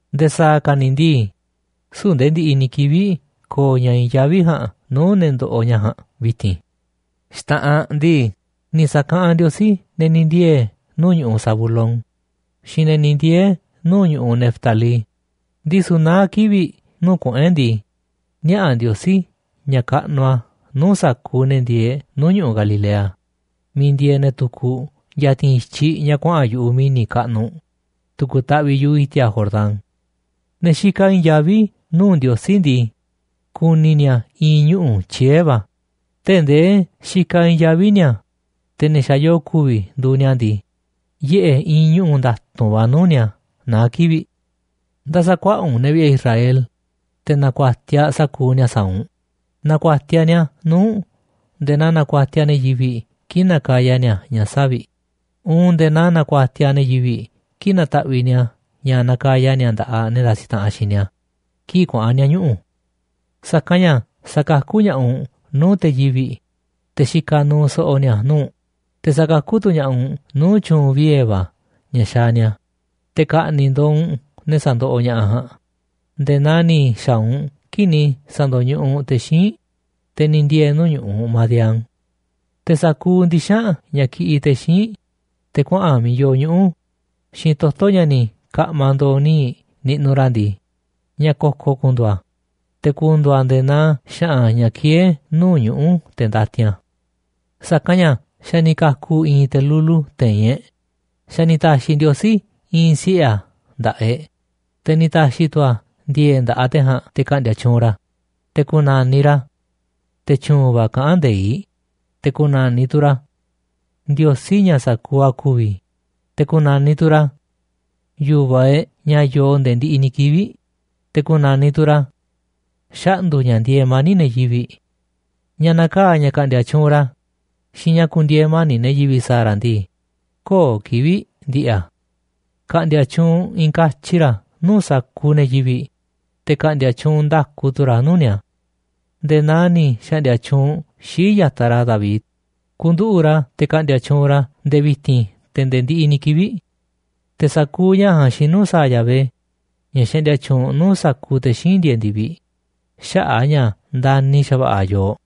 Nde̱e̱ sa̱a̱ ka̱ ni̱ ndii, süu̱ꞌ nde̱e̱ ndiꞌiꞌ ni̱ kivi̱ꞌ ko̱o̱ ña̱ i̱i̱n yaví ja̱a̱nꞌ nuu̱ꞌ ne̱ ndoꞌoꞌ ña̱ ja̱a̱nꞌ vi̱ti̱n. Xta̱ꞌanꞌ ndii, ni̱ sa̱kaꞌanꞌ Ndiosí ne̱ ni̱ ndiee̱ nuu̱ꞌ ñu̱ꞌuꞌ Zabulón xiinꞌ ne̱ ni̱ ndiee̱ nuu̱ꞌ ñu̱ꞌuꞌ Neftalí, ndisu̱ naá kivi̱ꞌ nuu̱ꞌ kuꞌu̱n e̱ꞌ ndii, niaꞌa̱ Ndiosí ña̱ kaꞌnuꞌ a̱ nuu̱ꞌ sa̱kuuꞌ ne̱ ku̱ndi̱e̱e̱ nuu̱ꞌ ñu̱ꞌuꞌ Galilea miiꞌ ndieeꞌ ne̱ tukuꞌ ya̱ti̱n i̱tyiꞌ ña̱ kuaꞌa̱n yu̱ꞌuꞌ mi̱ni̱ kaꞌnuꞌ tu̱ku̱ taꞌviꞌ yu̱ꞌuꞌ i̱ti̱a̱ Jordán. Ne̱ xikaꞌ i̱i̱n yaví nuu̱ꞌ Ndiosí ndii, ku̱ni̱ ni̱a̱ i̱i̱n ñuꞌu̱ tyiee̱ va̱ tee̱ꞌ ndee xikaꞌ i̱i̱n yaví ni̱a̱, te̱ ne̱ xa̱ yoo ku̱vi̱ nduuꞌ ni̱a̱ ndii, yiꞌe̱ i̱i̱n ñuꞌu̱ nda̱tu̱nꞌ va̱ nuu̱ꞌ ni̱a̱ naá kivi̱ꞌ. Nda̱sa̱ kuaꞌa̱ꞌ u̱nꞌ ne̱ vi̱ꞌe̱ Israel, te̱ na̱ku̱a̱tiaꞌ sa̱kuuꞌ ni̱a̱ sa̱a̱ u̱nꞌ. Na̱ku̱a̱tiaꞌ ni̱a̱ nuu̱ꞌ u̱nꞌ nde̱e̱ naa nakuatiaꞌ ne̱ yivi̱ꞌ kii̱ꞌ nakaya ni̱a̱ ña̱ savi̱ꞌ uun nde̱e̱ naa nakuatiaꞌ ne̱ yivi̱ꞌ kii̱ꞌ nataꞌviꞌ ni̱a̱ ña̱ nakaya ni̱a̱ nda̱ꞌaꞌ ne̱ ndasiꞌ taꞌanꞌ xiinꞌ ni̱a̱ kii̱ꞌ kuaꞌa̱n ni̱a̱ ñuꞌu̱. Sa̱kanꞌ ña̱ sa̱kakú ña̱ꞌaꞌ u̱nꞌ nuu̱ꞌ te̱ yivi̱ꞌ, te̱ xikaꞌ nuuꞌ so̱ꞌo̱ ni̱a̱ nuu̱ꞌ, te̱ sa̱kakú tu̱ ña̱ꞌaꞌ u̱nꞌ nuu̱ꞌ tyu̱u̱n viee̱ va̱ ña̱ xaaꞌ ni̱a̱, te̱ ka̱ꞌni̱ꞌ ndo̱o̱ u̱nꞌ ne̱ sandoꞌoꞌ ña̱ꞌaꞌ ja̱a̱nꞌ nde̱e̱ naa ni̱ xa̱a̱ u̱nꞌ kii̱ꞌ ni̱ sa̱ndo̱ñuꞌuꞌ u̱nꞌ te̱ xíinꞌ, te̱ ni̱ ndiee̱ nuu̱ꞌ ñu̱ꞌuꞌ Madián. Te̱ sa̱kuuꞌ ndixa̱nꞌ ña̱ kiꞌiꞌ te̱ xíinꞌ, te̱ kuaꞌa̱n miiꞌ yoo ñuꞌu̱ xiinꞌ toto̱ ña̱ ni̱ ka̱ꞌma̱ ndo̱o̱ níiꞌ niꞌnuꞌ ra̱ ndii, ña̱ ko̱ko̱ ku̱ndu̱u̱ a̱, te̱ ku̱ndu̱u̱ a̱ nde̱e̱ naa xa̱ꞌa̱n ña̱ kieé nuu̱ꞌ ñuꞌu̱ te̱ ndatin a̱. Sa̱kanꞌ ña̱ xa̱ ni̱ ka̱ku̱ i̱i̱n te̱ lulu te̱i̱n e̱ꞌ, xa̱ ni̱ ta̱xi̱ Ndiosí i̱i̱n siꞌe̱ a̱ nda̱ꞌaꞌ e̱ꞌ, te̱ ni̱ ta̱xi̱ tu̱ a̱ ndi̱e̱e̱ꞌ nda̱ꞌaꞌ te̱ ja̱a̱nꞌ te̱ ka̱ꞌndi̱a̱ tyuunꞌ ra̱, te̱ ku̱na̱niꞌ ra̱ Te̱ Tyu̱u̱n va̱ Kaꞌán Nde̱iꞌ, te̱ ku̱na̱niꞌ tu̱ ra̱ Ndiosí Ña̱ Sa̱kuuꞌ a̱ Ku̱vi̱, te̱ ku̱na̱niꞌ tu̱ ra̱ Yu̱vaꞌ e̱ꞌ Ña̱ Yoo Nde̱e̱ Ndiꞌiꞌ ni̱ Kivi̱ꞌ, te̱ ku̱na̱niꞌ tu̱ ra̱ Xaꞌndu̱ ña̱ Ndieeꞌ Mani̱ꞌ Ne̱ Yivi̱ꞌ. Ña̱ na̱kaa̱ ña̱ ka̱ꞌndi̱a̱ tyuunꞌ ra̱ xiinꞌ ña̱ ku̱ndi̱e̱e̱ mani̱ꞌ ne̱ yivi̱ꞌ sa̱a̱ ra̱ ndii, köo̱ꞌ kivi̱ꞌ ndi̱ꞌi̱ a̱. Ka̱ꞌndi̱a̱ tyuunꞌ i̱i̱n katyi ra̱ nuu̱ꞌ sa̱kuuꞌ ne̱ yivi̱ꞌ, te̱ ka̱ꞌndi̱a̱ tyuunꞌ nda̱ku tu̱ ra̱ nuu̱ꞌ ni̱a̱ nde̱e̱ naa ni̱ xa̱ꞌndi̱a̱ tyuunꞌ xii̱ꞌ ya̱taꞌ ra̱ David ku̱nduꞌu̱ꞌ ra̱ te̱ ka̱ꞌndi̱a̱ tyuunꞌ ra̱ nde̱e̱ vi̱ti̱n te̱ nde̱e̱ ndiꞌiꞌ ni̱ kivi̱ꞌ. Te̱ sa̱kuuꞌ ña̱ ja̱a̱nꞌ xinu̱ sa̱a̱ Yahvé, ña̱ xaꞌndia tyuunꞌ nuu̱ꞌ sa̱kuuꞌ te̱ xíinꞌ ndieeꞌ ndi̱viꞌ, xaꞌa̱ꞌ a̱ ña̱ ndani̱ xa̱va̱ꞌa̱ a̱ yooꞌ.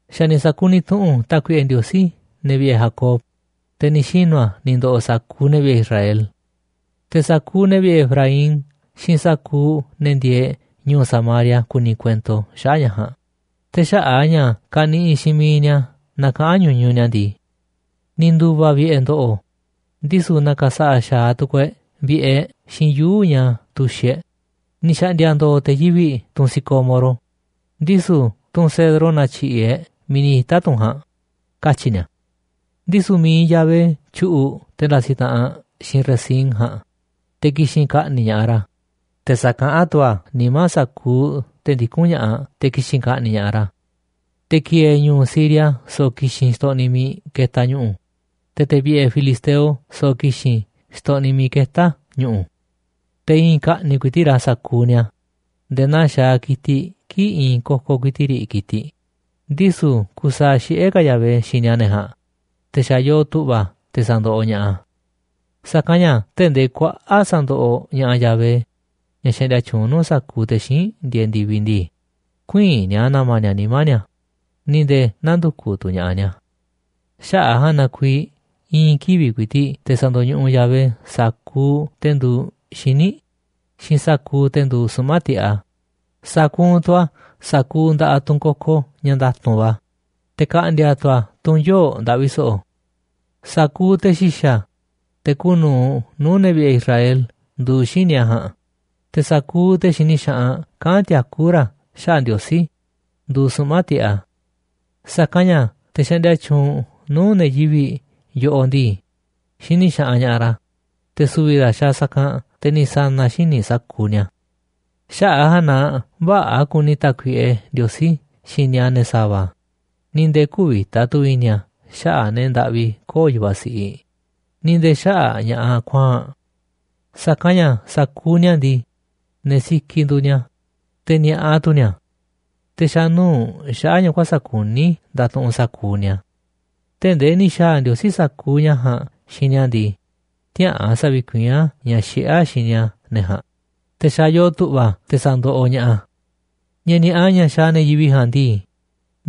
Xa̱ ni̱ sa̱kuniꞌ tu̱ꞌu̱n Tákuiꞌe Ndiosí ne̱ vi̱ꞌe̱ Jacob, te̱ ni̱ xinu̱ a̱ ni̱ ndo̱ꞌo̱ sa̱kuuꞌ ne̱ vi̱ꞌe̱ Israel. Te̱ sa̱kuuꞌ ne̱ vi̱ꞌe̱ Efraín xiinꞌ sa̱kuuꞌ ne̱ ndieeꞌ ñu̱u̱ Samaria ku̱ni̱ kuento xaꞌa̱ꞌ ña̱ ja̱a̱nꞌ, te̱ xaꞌa̱ꞌ a̱ ña̱ kaniꞌiꞌ xiinꞌ miiꞌ ni̱a̱ na kaꞌán ñuñuꞌ ni̱a̱ ndii: “Ni̱ ndu̱va̱ vi̱ꞌe̱ ndo̱ꞌo̱, ndisu̱ na̱ka̱sa̱ꞌa̱ xa̱aꞌ tu̱ku̱u̱ e̱ꞌ vi̱ꞌe̱ e̱ꞌ xiinꞌ yuu̱ꞌ ña̱ tu̱xiꞌ e̱ꞌ. Ni̱ xa̱ꞌndi̱a̱ ndo̱o̱ te̱ yivi̱ꞌ tunꞌ sicómoro, ndisu̱ tunꞌ cedro na̱tyi̱ꞌi̱ e̱ꞌ miiꞌ ni̱ ita̱ tunꞌ ja̱a̱nꞌ”, katyi̱ ni̱a̱. Ndisu̱ mi̱iꞌ Yahvé tyu̱ꞌu̱ꞌ te̱ ndasiꞌ taꞌanꞌ xiinꞌ Rezín ja̱a̱nꞌ, te̱ ki̱xi̱n ka̱ꞌni̱ꞌ ña̱ꞌaꞌ ra̱, te̱ sa̱kaꞌán tu̱ a̱ nimá sa̱kuuꞌ te̱ ndikún ña̱ꞌaꞌ te̱ ki̱xi̱n ka̱ꞌni̱ꞌ ña̱ꞌaꞌ ra̱. Te̱ ki̱e̱e̱ ñu̱u̱ Siria so̱ꞌo̱ ki̱xi̱n xtoꞌniꞌ miiꞌ ketaꞌ ñu̱ꞌu̱, te̱ te̱ vi̱ꞌe̱ filisteo so̱ꞌo̱ ki̱xi̱n xtoꞌniꞌ miiꞌ ketá ñu̱ꞌu̱. Te̱ i̱i̱n ka̱ꞌni̱ꞌ ku̱i̱ti̱ꞌ ra̱ sa̱kuuꞌ ni̱a̱ nde̱e̱ naa xaaꞌ ki̱tiꞌ kii̱ꞌ i̱i̱n kokoꞌ ku̱i̱ti̱ꞌ riꞌ ki̱tiꞌ, ndisu̱ kusaaꞌ xiꞌé ka̱ Yahvé xini a̱ ne̱ ja̱a̱nꞌ, te̱ xa̱ yoo tu̱ꞌva̱ a̱ te̱ sa̱ndoꞌoꞌ ña̱ꞌaꞌ a̱. Sa̱kanꞌ ña̱ tee̱ꞌ ndee kuaꞌa̱ꞌ sa̱ndoꞌoꞌ ña̱ꞌaꞌ Yahvé, ña̱ xaꞌndia tyuunꞌ nuu̱ꞌ sa̱kuuꞌ te̱ xíinꞌ ndieeꞌ ndi̱viꞌ ndii, ku̱ï̱i̱n ni̱a̱ na̱ma̱ ni̱a̱ nimá ni̱a̱ ni̱ nde̱e̱ nä̱ndu̱kuꞌ tu̱ ña̱ꞌaꞌ ni̱a̱. Xaꞌa̱ꞌ a̱ ja̱a̱nꞌ na kuiiꞌ i̱i̱n kivi̱ꞌ ku̱i̱ti̱ꞌ te̱ sa̱ndo̱ñuꞌuꞌ Yahvé sa̱kuuꞌ te̱ nduuꞌ xíniꞌ xiinꞌ sa̱kuuꞌ te̱ nduuꞌ suꞌma̱ꞌ tiꞌeꞌ a̱, sa̱kuunꞌ tu̱ a̱ sa̱kuuꞌ nda̱ꞌaꞌ tunꞌ koko ña̱ nda̱tu̱nꞌ va̱, te̱ ka̱ꞌndi̱a̱ tu̱ a̱ tunꞌ yoo̱ꞌ ndaꞌvi so̱ꞌo̱. Sa̱kuuꞌ te̱ xi̱xa̱, te̱ kuuꞌ nu̱uꞌ nuu̱ꞌ ne̱ vi̱ꞌe̱ Israel, nduuꞌ xíniꞌ a̱ ja̱a̱nꞌ, te̱ sa̱kuuꞌ te̱ xini xaꞌanꞌ kaꞌán tiakú ra̱ xaꞌa̱ꞌ Ndiosí, nduuꞌ suꞌma̱ꞌ tiꞌeꞌ a̱. Sa̱kanꞌ ña̱ te̱ xaꞌndia tyuunꞌ nuu̱ꞌ ne̱ yivi̱ꞌ yoꞌoꞌ ndii, xini xaꞌanꞌ ña̱ꞌaꞌ ra̱, te̱ su̱vi̱ ra̱ xaaꞌ sa̱kanꞌ te̱ ni̱ sa̱na̱ xíniꞌ sa̱kuuꞌ ni̱a̱. Xaꞌa̱ꞌ a̱ ja̱a̱nꞌ na vä̱ꞌa̱ kuni Tákuiꞌe Ndiosí xini a̱ ne̱ sa̱va̱, ni̱ nde̱e̱ kü̱vi̱ta tu̱ i̱ni̱ a̱ xaꞌa̱ꞌ ne̱ ndaꞌvi köo̱ꞌ yu̱vaꞌ siꞌiꞌ, ni̱ nde̱e̱ xaꞌa̱ꞌ ña̱ꞌaꞌ kuaa̱nꞌ. Sa̱kanꞌ ña̱ sa̱kuuꞌ ni̱a̱ ndii, ne̱ sikiꞌ nduuꞌ ni̱a̱, te̱ ni̱a̱ꞌa tu̱ ni̱a̱, te̱ xa̱ nuu̱ꞌ xaꞌa̱ꞌ ña̱ kuäsa̱ꞌ kuní ndatuꞌunꞌ sa̱kuuꞌ ni̱a̱. Tee̱ꞌ ndee ni̱ xa̱a̱ Ndiosí sa̱kuuꞌ ña̱ ja̱a̱nꞌ xiinꞌ ni̱a̱ ndii, tiäꞌa̱an sa̱vi̱kuiín a̱ ña̱ xiꞌé a̱ xini a̱ ne̱ ja̱a̱nꞌ, te̱ xa̱ yoo tu̱ꞌva̱ a̱ te sa̱ndoꞌoꞌ ña̱ꞌaꞌ a̱. Ña̱ ni̱a̱ꞌa ña̱ xaaꞌ ne̱ yivi̱ꞌ ja̱a̱nꞌ ndii,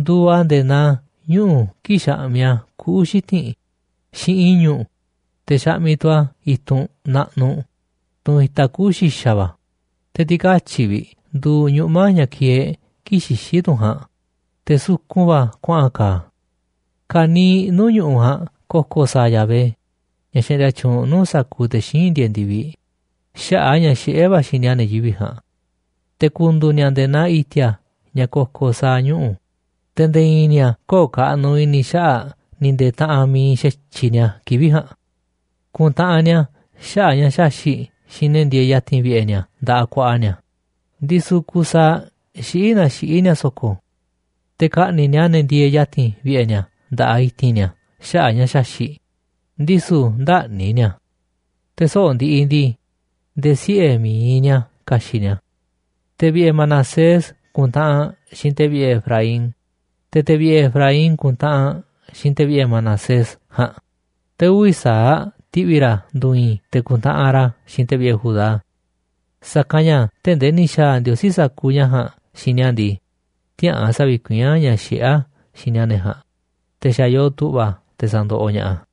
nduuꞌ a̱ nde̱e̱ naa ñuꞌu̱ kii̱ꞌ xaꞌmiꞌ a̱ kuꞌu̱ xiti̱nꞌ xiinꞌ i̱ñu̱ꞌ, te̱ xaꞌmiꞌ tu̱ a̱ i̱tunꞌ naꞌnuꞌ, tunꞌ itaꞌ kuꞌu̱ xi̱xa̱ va̱, te̱ ti̱katyi̱ꞌ vi̱ꞌ nduuꞌ ñuꞌma̱ ña̱ kieeꞌ kii̱ꞌ xixí tunꞌ ja̱a̱nꞌ, te̱ sukun va̱ kuaꞌa̱n ka̱a̱ a̱. Ka̱niiꞌ nuu̱ꞌ ñu̱ꞌuꞌ ja̱a̱nꞌ ko̱ko̱ sa̱a̱ Yahvé, ña̱ xaꞌndia tyuunꞌ nuu̱ꞌ sa̱kuuꞌ te̱ xíinꞌ ndieeꞌ ndi̱viꞌ, xaꞌa̱ꞌ a̱ ña̱ xiꞌé va̱ a̱ xini a̱ ne̱ yivi̱ꞌ ja̱a̱nꞌ. Te̱ ku̱ndu̱u̱ ni̱a̱ nde̱e̱ naa i̱ti̱a̱ ña̱ ko̱ko̱ sa̱a̱ ñuꞌu̱, te̱ nde̱e̱ i̱i̱n ni̱a̱ köo̱ꞌ kaꞌnuꞌ i̱ni̱ xaꞌa̱ꞌ ni̱ nde̱e̱ taꞌanꞌ mi̱iꞌ xa̱tyiꞌ ni̱a̱ kivi̱ꞌ ja̱a̱nꞌ. Ku̱ntaꞌanꞌ ni̱a̱ xaꞌa̱ꞌ ña̱ xaxi̱ꞌ xiinꞌ ne̱ ndieeꞌ ya̱ti̱n vi̱ꞌe̱ ni̱a̱ nda̱ꞌaꞌ ku̱a̱ꞌa̱ ni̱a̱, ndisu̱ kusaaꞌ xiꞌí naa xiꞌí ni̱a̱ so̱ko̱. Te̱ ka̱ꞌni̱ꞌ ni̱a̱ ne̱ ndieeꞌ ya̱ti̱n vi̱ꞌe̱ ni̱a̱ nda̱ꞌaꞌ i̱ti̱n ni̱a̱ xaꞌa̱ꞌ ña̱ xaxi̱ꞌ, ndisu̱ ndä̱ꞌni̱ ni̱a̱. Te̱ soꞌo̱ꞌ ndiꞌiꞌ ndii, nde̱e̱ siꞌe̱ mi̱iꞌ ni̱a̱ ka̱xi̱ꞌ ni̱a̱. Te̱ vi̱ꞌe̱ Manasés ku̱ntaꞌanꞌ xiinꞌ te̱ vi̱ꞌe̱ Efraín, te̱ te̱ vi̱ꞌe̱ Efraín ku̱ntaꞌanꞌ xiinꞌ te̱ vi̱ꞌe̱ Manasés ja̱a̱nꞌ, te̱ uvi̱ sa̱aꞌ ti̱ꞌvi̱ ra̱ ndu̱i̱i̱n, te̱ ku̱ntaꞌanꞌ ra̱ xiinꞌ te̱ vi̱ꞌe̱ Judá. Sa̱kanꞌ ña̱ tee̱ꞌ ndee ni̱ xa̱a̱ Ndiosí sa̱kuuꞌ ña̱ ja̱a̱nꞌ xiinꞌ ni̱a̱ ndii, tiäꞌa̱an sa̱vi̱kuiín a̱ ña̱ xiꞌé a̱ xini a̱ ne̱ ja̱a̱nꞌ, te̱ xa̱ yoo tu̱ꞌva̱ a̱ te̱ sa̱ndoꞌoꞌ ña̱ꞌaꞌ a̱.